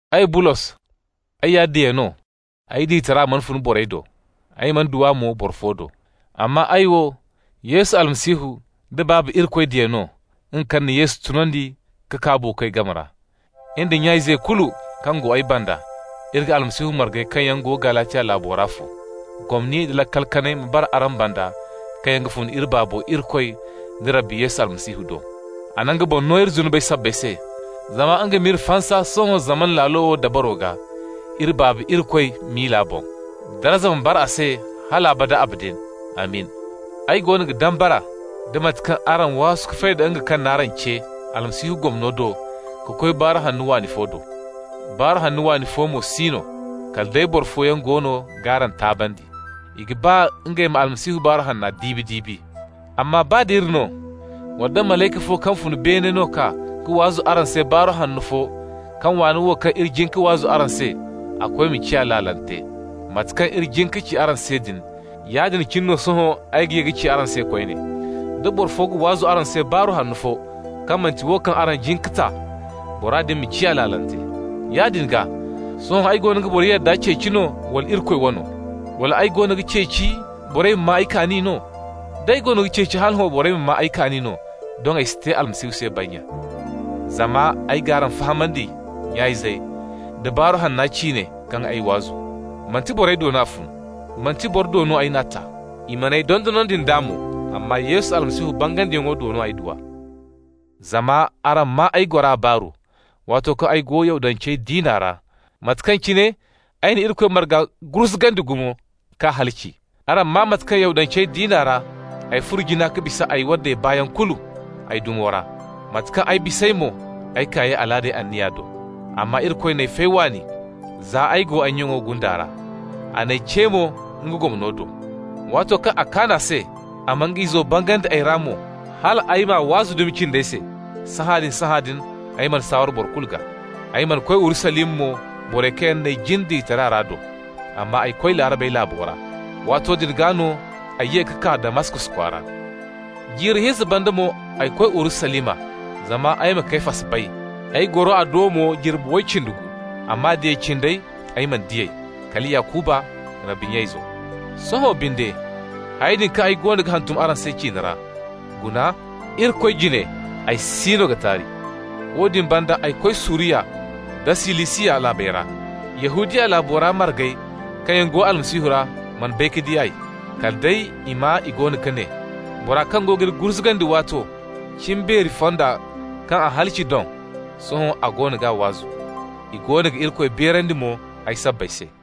Ay, Bulos, ay ya diya no. Ay diyatara mana fun borey do. Ay mana du a mo boro fo do. Amma ay wo, Yesu Almasihu da Baaba Irikoy diya no, nga kaŋ na Yesu tunandi ka kaa buukoy game ra. In da nya-izey kulu kaŋ go ay banda, iri ga Almasihu margey kaŋ yaŋ go Galatiya laabo ra fo. Gomni nda laakal kanay ma bara araŋ banda kaŋ yaŋ ga fun iri Baabo Irikoy da Rabbi Yesu Almasihu do. A na nga boŋ no iri zunubey sabbay se zama nga m'iri fansa sohõ zamana laalo wo dabaro gaa, iri Baabo Irikoy miila boŋ. Darza ma bara a se hal abada abadin! Amin! Ay goono ga dambara nda mate kaŋ araŋ waasu ka fay da nga kaŋ n'araŋ ce Almasihu gomno do ka koy baaru hanno waani fo do. Baaru hanno waani fo mo si no, kala day boro fooyaŋ goono g'araŋ taabandi. I ga ba ngey ma Almasihu Baaru Hanna diibi-diibi. Amma baa d'iri no, wala nda malayka fo kaŋ fun beene no ga kaa ka waazu araŋ se baaru hanno fo kaŋ waana wo kaŋ iri jin ka waazu araŋ se, a koy ma ciya laalante. Mate kaŋ iri jin ka ci araŋ se din, yaadin cine no sohõ ay ga ye ka ci araŋ se koyne: da boro fo ga waazu araŋ se baaru hanno fo kaŋ manti wo kaŋ araŋ jin ka ta, bora din ma ciya laalante. Yaadin gaa, sohõ ay goono ga borey yadda ceeci no, wala Irikoy wano? Wala, ay goono ga ceeci borey ma maa ay kaani no? D'ay goono ga ceeci hala hõ borey ma maa ay kaani no, doŋ ay si te Almasihu se bannya. Zama ay g'araŋ fahamandi, nya-izey, da Baaru Hanna ciine kaŋ ay waazu. Manti borey do no a fun. Manti boro do no ay n'a ta, i man'ay dondonandi nd'a mo, amma Yesu Almasihu bangandiyaŋo do no ay du a. Zama araŋ maa ay gora baaru, waato kaŋ ay go Yahudancey diina ra, mate kaŋ cine ay na Irikoy marga gurzugandi gumo k'a halaci. Araŋ maa mate kaŋ Yahudancey diina ra ay furo jina ka bisa ay waddey baayaŋ kulu ay dumo ra, mate kaŋ ay bis'ey mo ay kaayey alaadey anniya do. Amma Irikoy n'ay fay waani za ay go ay nyaŋo gunda ra. A n'ay ce mo nga gomno do. Waato kaŋ a kaan a se a ma nga Izo bangandi ay ra mo, hal ay m'a waazu dumi cindey se, sahãadin-sahãadin ay mana saaware boro kulu gaa. Ay mana koy Urusalima mo borey kaŋ yaŋ n'ay jin diyataray ra do. Amma ay koy Laarabey laabo ra. Waato din gaa no ay ye ka kaa Damaskos kwaara. Jiiri hinza banda mo ay koy Urusalima zama ay ma Kefas bay, ay goro a do mo jirbi way cindi gu. Amma diya cindey, ay mana di ey, kala Yakuba, Rabbi nya izo. Sohõ binde, hayey din kaŋ ay goono ga hantum araŋ se ciine ra, guna: Irikoy jine ay siino ga taari. Woodin banda ay koy Suriya nda Silisiya laabey ra. Yahudiya laabo ra margey kaŋ yaŋ go Almasihu ra mana bay ka di ay. Kala day i maa i go ga ne: «Bora kaŋ go g'iri gurzugandi waato, cimbeeri fonda kaŋ a halaci doŋ, sohõ a goono g'a waazu.» I goono ga Irikoy beerandi mo ay sabbay se.